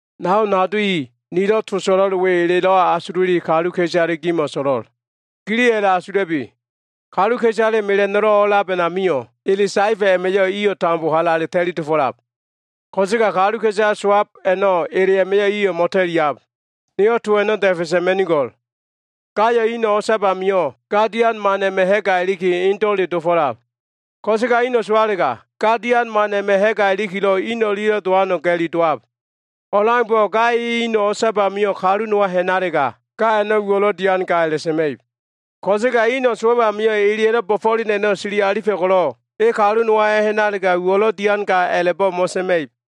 Nao nado i, nilo꞉ to so꞉lo꞉l we elelo꞉ asululi kaluka꞉isale gimo꞉ so꞉lo꞉l. Giliyo꞉ a꞉la꞉asula꞉bi. Kaluka꞉isale mela꞉no꞉lo꞉ o꞉lab a꞉namio꞉, ele saefa꞉ a꞉ma꞉yo꞉ iyo꞉ tambo halale ta꞉li dofo꞉lab. Ko꞉sega kaluka꞉isale sowab a꞉no꞉, ele a꞉ma꞉yo꞉ iyo꞉ mo꞉ta꞉liab. Niyo꞉ to a꞉no꞉ da꞉fe sa꞉ma꞉nigo꞉l. Gayo꞉ ino꞉ o꞉sab amio꞉, ga dian man a꞉ma꞉ ha꞉ga iliki, indo꞉le dofo꞉lab. Ko꞉sega ino꞉ sowalega, ga dian man a꞉ma꞉ ha꞉ga ilikilo꞉ in o꞉lia꞉lo꞉ dowano꞉ ga꞉li dowab. O꞉leaumbo꞉, ga e ino꞉ o꞉sab amio꞉ kalu nowa ha꞉nalega, ga a꞉no꞉ uwo꞉lo꞉ dian ga a꞉la꞉sa꞉ma꞉ib. Ko꞉sega ino꞉ sowab amio꞉, eleya꞉lo꞉ bo꞉fo꞉len a꞉no꞉ sili alifa꞉ ko꞉lo꞉, e kalu nowa a꞉ha꞉nalega, uwo꞉lo꞉ dian ga a꞉la꞉bo꞉ mo꞉sa꞉ma꞉ib.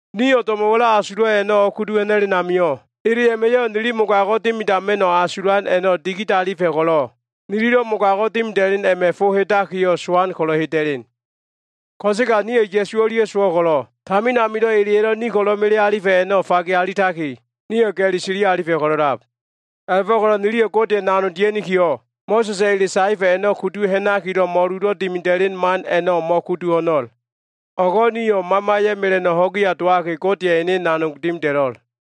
Nio꞉ do꞉mo꞉wa꞉lo꞉ asulo꞉ a꞉no꞉ o꞉kudu ha꞉na꞉len amio꞉, ele a꞉ma꞉yo꞉ nili mogago꞉ dimidama꞉no꞉ asulan a꞉no꞉ digidalifa꞉ ko꞉lo꞉, nililo꞉ mogago꞉ dimida꞉len a꞉ma꞉ fo hedakiyo꞉, sowan ko꞉lo꞉ heda꞉len. Ko꞉sega nio꞉ Ya꞉su o꞉lia꞉ sowo꞉ ko꞉lo꞉, tamin amilo꞉ eleya꞉lo꞉ ni ko꞉lo꞉ melealifa꞉ a꞉no꞉ fage alitaki, nio꞉ ga꞉li sili alifa꞉ ko꞉lo꞉lab. A꞉la꞉fo꞉ko꞉lo꞉ niliyo꞉ Godeya꞉ nanog dia꞉nikiyo꞉, Mo꞉sa꞉sa꞉ ele saefa꞉ a꞉no꞉ kudu ha꞉nakilo꞉ mo꞉lulo꞉ dimida꞉len man a꞉no꞉ mo꞉kudu ho꞉no꞉l. O꞉go꞉ nio꞉ Mamaya꞉ mela꞉no꞉ ho꞉giya dowaki, Godeya꞉ ene nanog dimida꞉lo꞉l.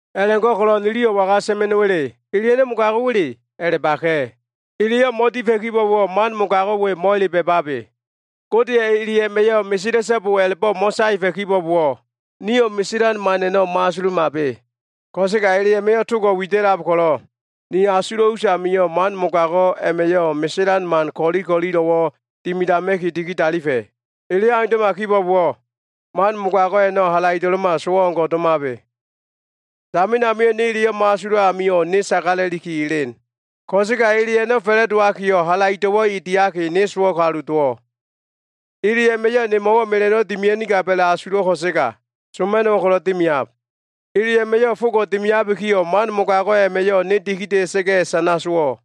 A꞉la꞉go꞉ko꞉lo꞉ niliyo꞉ waga sa꞉ma꞉no꞉wa꞉le? Ele a꞉no꞉ mogago꞉wa꞉le? A꞉la꞉baka꞉. Eleyo꞉ mo꞉difa꞉ kibo꞉bowo꞉, man mogago꞉ we mo꞉ele ba꞉babe. Godeya꞉ ele a꞉ma꞉yo꞉ “Mesela꞉so꞉bo” a꞉la꞉bo꞉ mo꞉saefa꞉ kibo꞉bowo꞉, niyo꞉ meselan man a꞉no꞉ mo꞉asulumabe. Ko꞉sega ele a꞉ma꞉yo꞉ togo꞉ wida꞉lab ko꞉lo꞉, ni asulo꞉ us amio꞉ man mogago꞉ a꞉ma꞉yo꞉ meselan man ko꞉li ko꞉lilo꞉wo꞉ dimidama꞉ki digidalifa꞉. Eleyo꞉ aundo꞉ma kibo꞉bowo꞉, man mogago꞉ a꞉no꞉ halaido꞉lo꞉ma sowo꞉ o꞉ngo꞉ domabe. Tamin amio꞉ ne eleyo꞉ mo꞉asulo꞉ amio꞉, ne sagala꞉liki elen. Ko꞉sega ele a꞉no꞉ fa꞉la꞉dowakiyo꞉ halaido꞉wo꞉ e diaki, ne sowo꞉ kalu dowo꞉. Ele a꞉ma꞉yo꞉ nemo꞉wo꞉ mela꞉no꞉wo꞉ dimia꞉nigab a꞉la꞉asulo꞉ ko꞉sega, soma꞉no꞉wo꞉ ko꞉lo꞉ dimiab. Ele a꞉ma꞉yo꞉ fogo꞉ dimiabikiyo꞉, man mogago꞉ a꞉ma꞉yo꞉ ne dikida꞉sa꞉ga꞉ sana sowo꞉.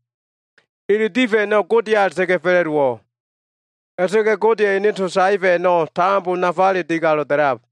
Ele difa꞉ a꞉no꞉ Godeya a꞉la꞉ta꞉ga꞉ fa꞉la꞉dowo꞉. A꞉la꞉ta꞉ga꞉ Godeya꞉ ene to saefa꞉ a꞉no꞉ tambo nafale digalo꞉ da꞉lab.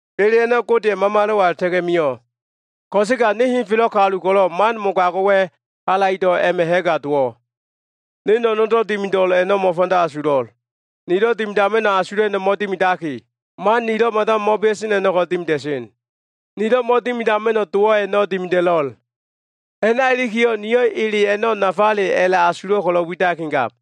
Ele a꞉no꞉ Godeya꞉ Mamalo꞉wa a꞉la꞉ta꞉ga꞉ mio꞉. Ko꞉sega ne henfelo꞉ kalu ko꞉lo꞉, man mogago꞉wa꞉ halaido꞉ a꞉ma꞉ ha꞉ga dowo꞉. Ne no꞉no꞉ndo꞉ dimido꞉l a꞉no꞉ mo꞉fanda asulo꞉. Nilo꞉ dimidama꞉no꞉ asulo꞉ a꞉no꞉ mo꞉dimidaki, man nilo꞉ mada mo꞉bea꞉sen a꞉no꞉ ko꞉lo꞉ dimida꞉sen. Nilo꞉ mo꞉dimidama꞉no꞉ dowo꞉ a꞉no꞉ dimida꞉lo꞉l. A꞉na ilikiyo꞉, niyo꞉ ele a꞉no꞉ nafale a꞉la꞉asulo꞉ ko꞉lo꞉ widakigab.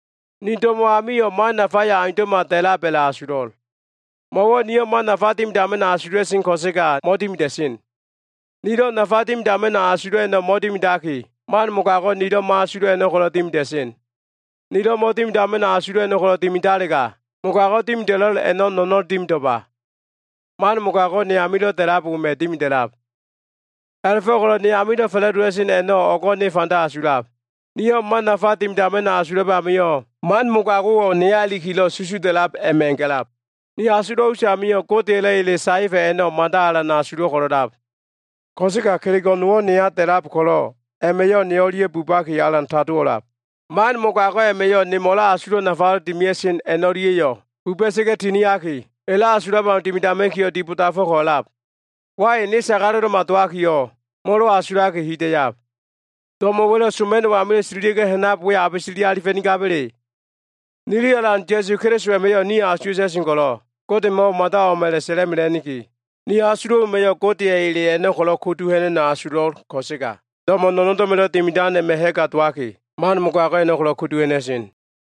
Ni do꞉mo꞉ amio꞉ man nafayo꞉ aundo꞉ma da꞉lab a꞉la꞉asulo꞉l. Mo꞉wo꞉ niyo꞉ man nafa dimidama꞉no꞉ asula꞉sen ko꞉sega mo꞉dimida꞉sen. Nilo꞉ nafa dimidama꞉no꞉ asulo꞉ a꞉no꞉ mo꞉dimidaki, man mogago꞉ nilo꞉ mo꞉asulo꞉ a꞉no꞉ ko꞉lo꞉ dimida꞉sen. Nilo꞉ mo꞉dimidama꞉no꞉ asulo꞉ a꞉no꞉ ko꞉lo꞉ dimidalega, mogago꞉ dimida꞉lo꞉l a꞉no꞉ no꞉no꞉n dimido꞉lba. Man mogago꞉ ne amilo꞉ da꞉lab wema꞉ dimida꞉lab. A꞉la꞉fo꞉ko꞉lo꞉ ne amilo꞉ fa꞉la꞉dowa꞉sen a꞉no꞉ o꞉go꞉ ne fanda asulab. Niyo꞉ man nafa dimidama꞉no꞉ asulab amio꞉, man mogago꞉wo꞉ neya ilikilo꞉ susuda꞉lab a꞉ma꞉ ga꞉lab. Ni asulo꞉ us amio꞉, Godeya꞉lo꞉ ele saefa꞉ a꞉no꞉ mada alan asulo꞉ ko꞉lo꞉lab. Ko꞉sega kelego꞉ nowo꞉ neya da꞉lab ko꞉lo꞉, a꞉ma꞉yo꞉ ne o꞉lia꞉ bubaki alan tadowo꞉lab. Man mogago꞉ a꞉ma꞉yo꞉ nemo꞉lo꞉ asulo꞉ nafalo꞉ dimia꞉sen a꞉no꞉lia꞉yo꞉ buba꞉sa꞉ga꞉ tiniaki, elo꞉ asulo꞉ au dimidama꞉kiyo꞉ dibodafo꞉ko꞉lab. Wai! Ne sagalo꞉lo꞉ma dowakiyo꞉, molo asulaki hida꞉yab. Do꞉mo꞉wa꞉lo꞉ soma꞉no꞉ amilo꞉ tililia꞉ga꞉lo꞉ ha꞉nab we abe sili alifa꞉nigaba꞉le? Nili Alan Ya꞉su Keliso a꞉ma꞉yo꞉ nio꞉ asuwa꞉ta꞉sen ko꞉lo꞉, Godemo꞉wo꞉ mada o꞉m a꞉la꞉sa꞉la꞉mela꞉niki. Ni asulo꞉ wema꞉yo꞉ Godeya꞉ ele a꞉no꞉ ko꞉lo꞉ kudu ha꞉na꞉no꞉ asulo꞉l ko꞉sega, do꞉mo꞉ no꞉ndo꞉ma꞉lo꞉ dimidan a꞉ma꞉ ha꞉ga dowaki, man mogago꞉ a꞉no꞉ ko꞉lo꞉ kudu ha꞉na꞉sen.